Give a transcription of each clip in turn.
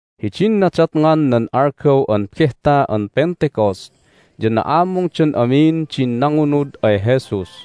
Hidin nadatngan nan algaw an Behta an Pentecost ya na'amungdan amin din nangunud ay Jesus.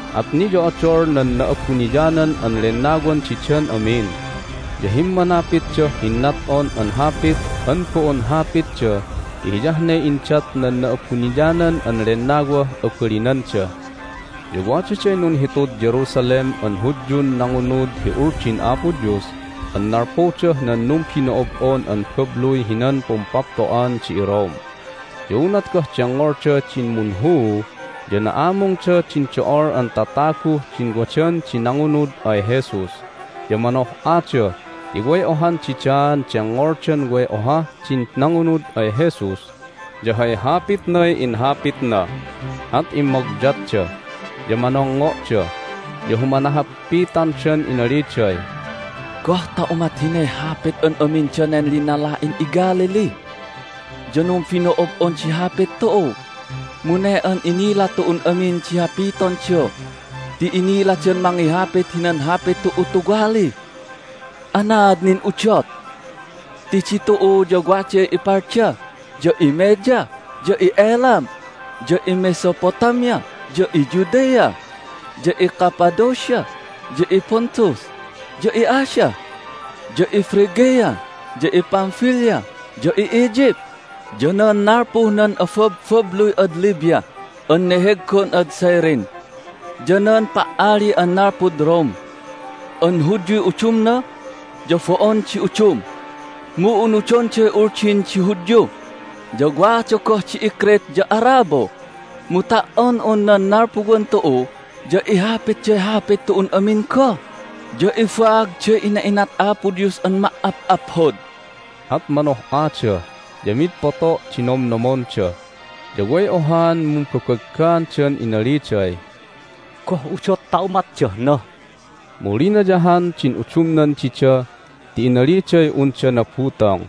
At niyo'odol nan Na'abuniyanan an Lennawan didan amin, ya himmanapitdah hinnat'on an hapit an bo'on hapitda ti hiyah ne indat nan Na'abuniyanan an Lennawah abalinanda. Ya wadaday nunhitud Jerusalem an Hudyun nangunud hi Uldin Apo Dios an nalpudah nan numbino'ob'on an babluy hinan Pumpapto'an di iRome. Ya unat goh dengngolda din munhuu ya na'amungda din do'ol an tataguh din wadan di nangunud ay Jesus, ya manoh'ada ti way ohan didaan dengngoldan way ohah din nangunud ay Jesus ya hay hapitnay inhapitna. At immogyatda, ya manongngo'da, ya humanahappitandan inaliday, "Goh ta umat hinay hapit an amin danen linala'in iGalilee? Ya numbino'ob'on di hapit tu'u, mu ne an inila tu'un amin di hapitonda ti iniladan mangihapit hinan hapit tu'u tuwali! Anaad nin udot? Ti ditu'u ya waday iParthia, ya iMedia, ya i'Elam, ya iMesopotamia, ya iJudea, ya iCappadocia, ya iPontus, ya i'Asia, ya iPhrygia, ya iPamphilia, ya i'Egypt, ya nan nalpuh nan ababbabluy ad Libya an neheggon ad Cyrene, ya nan pa"ali an nalpud Rome an Hudyuy udumna ya bo'on di udum, mu unudonday Uldin di Hudyu! Ya wada goh di iCrete ya Arabo. Mu ta"on un nan nalpuwan tu'u ya ihapitday hapit tu'un amin goh, ya ibaagday ina'inat Apo Dios an ma"ap'aphod!" At manoh'ada, ya mi'id poto' di nomnomonda, ya way ohaan mumbabaggaandan inaliday, "Goh udot ta umatdah na?" Mu linayahan din udumnan dida ti inaliday unda nabutong!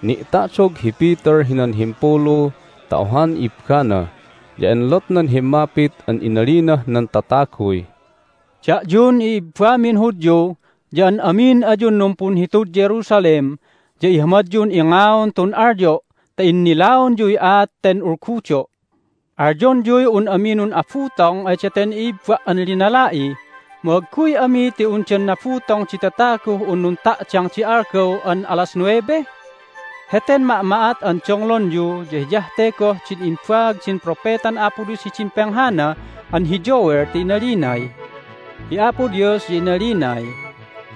Ni'ta'dog hi Peter hinan himpulu ta ohan ibbana, ya enlotnan himmapit an inalinah nan tataguy, "Da'yun i'ibbamin Hudyu ya an amin ayun numpunhitud Jerusalem ya ihamadyun ingaon tun alyo' ta innilaonyuy aat ten ulgudo'! Alyonyuy un ami nun'abutong ay daten i'ibba' an linala'i, mu agguy ami ti undan nabutong di tataguh un nunta'dang di algaw an alas nuebe? Heten ma'ma'at an donglonyu ya hiyah te goh din imbaag din propetan Apo Dios hidin penghana an hi Joel, ti inalinay, Hi Apo Dios ya inalinay,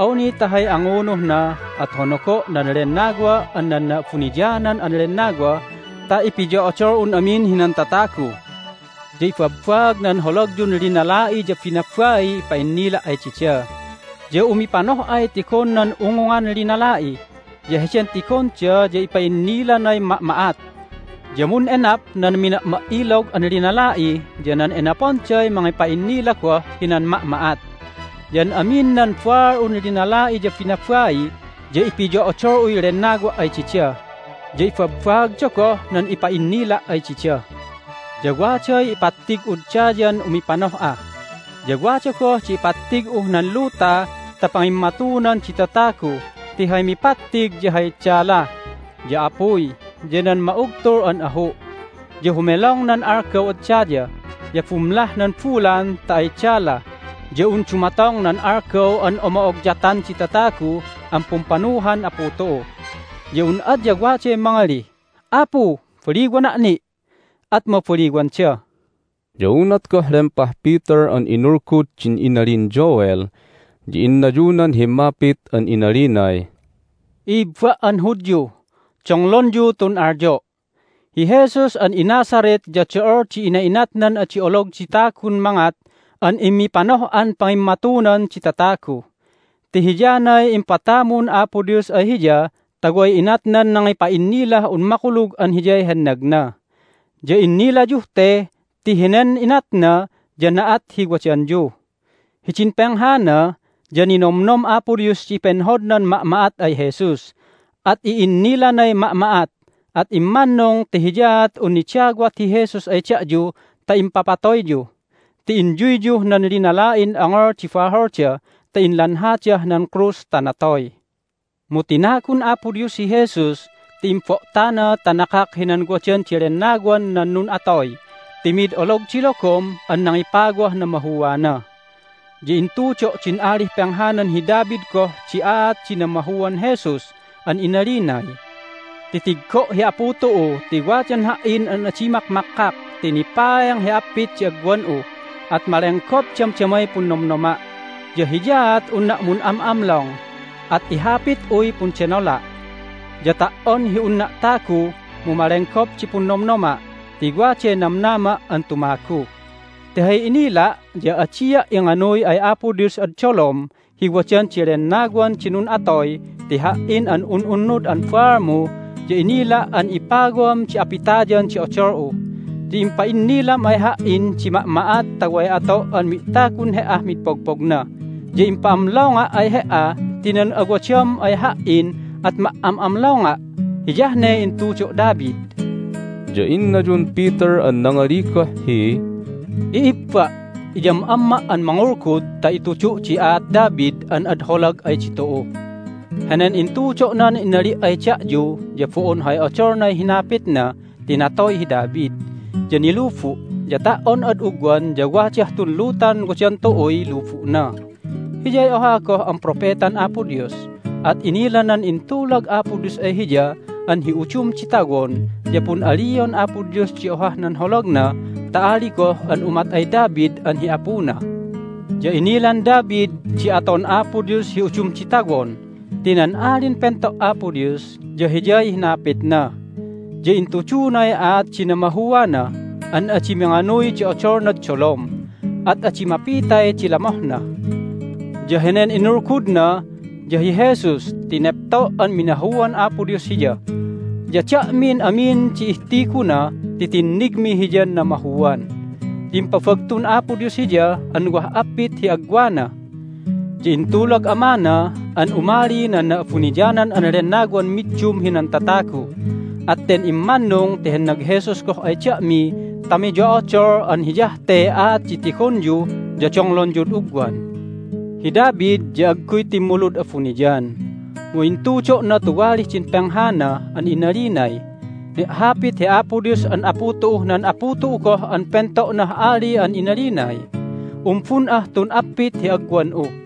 Awni ta hay angunuhna at honogo' nan Lennawa' an nan Na'abuniyanan an Lennawa ta ipiyo'odol'un amin hinan tatagu. Ya ibabbaag nan holagyun linala'i ya binabaiy ipa'innila' ay dida, ya umipanoh'ay tigon nan ungungan linala'i, ya heden tigonda ya ipa'innilanay ma'ma'at. Ya mun'enap nan mina'ma"ilog an linala'i, ya nan enaponday mangipa'innila goh hinan ma'ma'at. Ya an amin nan baal'un linala'i ya binabai ya ipiyo'odol'uy Lennawa' ay dida, ya ibabbaagda goh nan ipa'innila' ay dida. Ya waday ipattig'ud dayan umipanoh'a, ya wada goh di ipattig'uh nan luta ta pangimmatunan di tatagu ti hay mipattig ya hay dala, ya apuy, ya nan ma'ugtul an ahu'. Ya humelong nan algaw ad daya, ya bumlah nan bulan ta ay dala ya un dumatong nan algaw an omo'ogyatan di tatagu an pumpanuhan Apu tu'u. Ya un adya waday mangalih, Apu, baliwana' ni'! at mabaliwanda." Ya unat goh lempah Peter an inulgud din inalin Joel ya innayunan himmapit an inalinay, "I'ibba' an Hudyu, donglonyu tun alyo'! Hi Jesus an iNazareth ya do'ol di ina'inatnan adi olog di tagun mangat an immipanoh'an pangimmatunan di tatagu, ti hiyanay impatamun Apo Dios ay Hiya ta way inatnan nangipa'innilah un makulug an Hiyay hennagna. Ya innilayuh te ti henen inatna ya na'at hi wadanyu. Hidin penghana ya ninomnom Apo Dios di penhodnan ma'ma'at ay Jesus, at i'innilanay ma'ma'at, at immannung ti hiyaat un nidawat hi Jesus ay da'yu ta impapatoyyu, ti inyuyyuh nan linala'in ongol di baholda ta inlanhadah nan krus ta natoy. Mu tinagun Apo Dios hi Jesus ti imbo'tana ta nakak hinan wadan di lennawan nan nun'atoy ti mid olog di logom an nangipawah namahuana. Ya intudo' din alih penghanan hi David goh di aat di namahuan Jesus an inalinay, Titiggo' hi Apu tu'u ti wadan Ha"in an adi makmakkak ti nipaeng hi appit di agwan'u, at malenggop damdamay punnomnoma'. Ya hiyaat unna' mun'am'amlong, at ihapit'uy pundenola'. Ya ta"on hi unna' tagu mu malenggop di punnomnoma' ti waday namnama' an tumagu. Ti hay innila' ya adia' inganuy ay Apo Dios ad dolom hi wadan di lennawan di nun'atoy ti Ha"in an un'unnud an baalmu ya inila' an ipawam di apitayan di odol'u. Ya impa'innilam ay Ha"in di ma'ma'at ta way ato' an mi'tagun He"ah mid pogpogna, ya impa'amlonga' ay He"a ti nan awadam ay Ha"in at ma"am'amlonga'. Hiyah ne intudo' David." Ya innayun Peter an nangali goh hi, "I'ibba', iyam'amma' an mangulgud ta itudu' di aat David an ad holag ay ditu'u. Henen intudo'nan inali' ay da'yu ya bo'on hay odolnay hinapitna ti natoy hi David, ya nilubu', ya ta"on ad ugwan ya wadah tun lutan wadan tu'uy lubu'na. Hiyay oha goh an propetan Apo Dios, at inilanan intulag Apo Dios ay hiya an hi udum di tawon ya pun'alion Apo Dios di ohah nan holagna ta ali goh an umat ay David an hi apuna. Ya inilan David di aton Apo Dios hi udum di tawon ti nan Alin Pento' Apo Dios ya Hiyay hinapitna, ya intudunay aat di namahuana an adi minganuy di odolnad dolom, at adi mapitay di lamohna. Ya henen inulgudna ya hi Jesus ti nepto' an minahuan Apo Dios Hiya, ya da'min amin di ihtiguna ti tinnigmi Hiyan namahuan! Ya impabagtun Apo Dios Hiya an wah appit hi agwana! Ya intulag Amana an umali nan Na'abuniyanan an Lennawan middum hinan tatagu, at ten immannung ti hennag Jesus goh ay da'mi ta miyo'odol an hiyah tey aat di tigonyu ya donglonyud ugwan. Hi David ya agguy timmulud abuniyan, mu intudo'na tuwalih din penghana an inalinay, Ni'hapit hi Apo Dios an Apu tu'uh nan Apu tu'u goh an pento'nah ali an inalinay: Umbun'ah tun appit hi agwan'u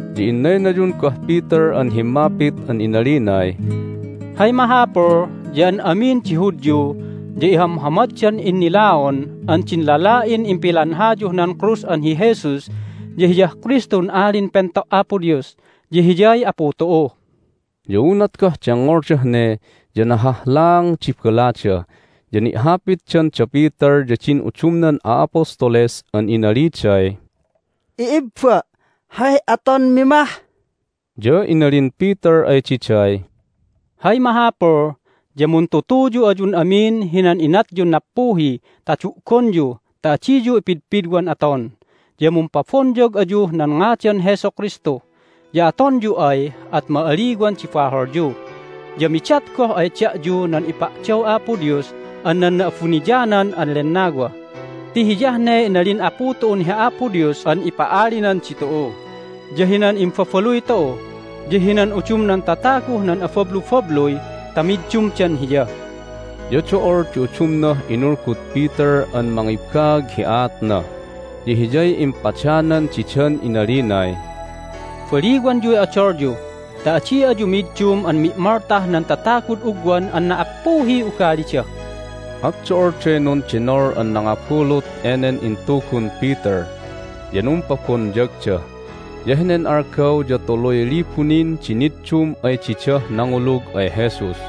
Ya innaynayun goh Peter an himmapit an inalinay, "Hay mahapul ya an amin di Hudyu ya ihamhamaddan innilaon an din lala'in impilanhayuh nan krus an hi Jesus ya Hiyah Kristun Alin Pento' Apo Dios, ya Hiyay Apu tu'u!" Ya unat goh dengngoldah ne ya nahahlaang di balada, ya ni'hapitdan da Peter ya din udumnan a'apostoles an inaliday, "I'ibba! Hay atonmi mah?" Ya inalin Peter ay diday, "Hay mahapul ya muntutuyu ayun amin hinan inatyun nappuhi ta du'gonyu ta adiyu ipidpidwan aton, ya mumpabonyag ayuh nan ngadan Jesu Kristu! Ya atonyu ay at ma'aliwan di baholyu, ya midat goh ay da'yu nan ipa'daw Apo Dios an nan Na'abuniyanan an Lennawa. Ti hiyah ne inalin Apu tu'un hi Apo Dios an ipa'alinan ditu'u, ya hinan imbabaluy tu'u, ya hinan udumnan tataguh nan abablubabluy ta middumdan Hiya." Ya do'ol di udumnah inulgud Peter an mangibaag hi aatna, ya hiyay impadanan didan inalinay, "Baliwanyuy odolyu ta adi ayu middum an mi'moltah nan tatagud ugwan an na"appuhiy ugalida!" At do'olday nundenol an nangabulut enen intugun Peter, ya numpabonyagda. Ya henen algaw ya tuluy libu nin di niddum ay didah nangulug ay Jesus.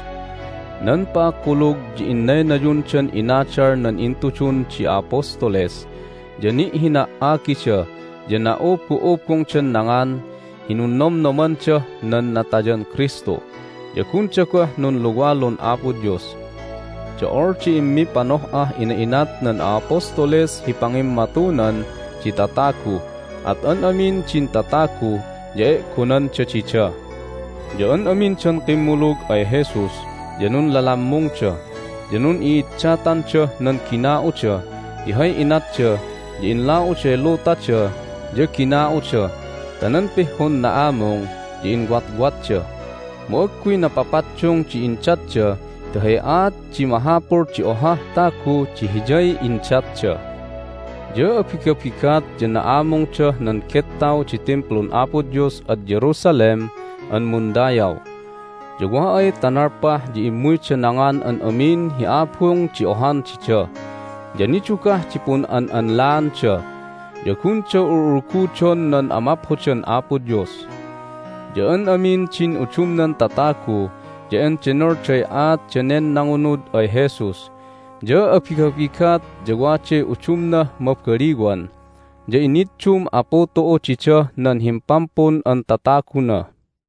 Nan pa"akkulug ya innaynayundan inadal nan intudun di a'apostoles, ya ni'hina"agida, ya na'ubu'ubungdan nangan hi Nunnomnomandah nan Natayan Kristu, ya gunda goh nunluwalun Apo Dios. Do'ol di immipanoh'ah ina'inat nan a'apostoles hi pangimmatunan di tatagu, at an amin din tatagu ya e'gonanda dida. Ya an amindan kimmulug ay Jesus ya nunlalammungda, ya nun'i'iddatandah nan gina'uda ti hay inatda ya inla'uday lutada ya gina'uda ta nan pihhun na'amung ya inwatwatda. Mu agguy napapaddung di indatda ti hay aat di mahapul di ohah tagu di hiyay indatda. Ya abigabigat ya na'amungdah nan gettaw di Timplun Apo Dios ad Jerusalem an mundayaw. Ya wa ay ta nalpah ya immuyda nangan an amin hi abung di ohan dida. Ya nidugah di pun'an'anlaanda, ya gunda ul'ulgudon nan amaphodan Apo Dios. Ya an amin din udumnan tatagu ya endenolday aat danen nangunud ay Jesus, ya abigabigat ya waday udumnah mabaliwan, ya iniddum Apu tu'u didah nan Himpampun an Tataguna.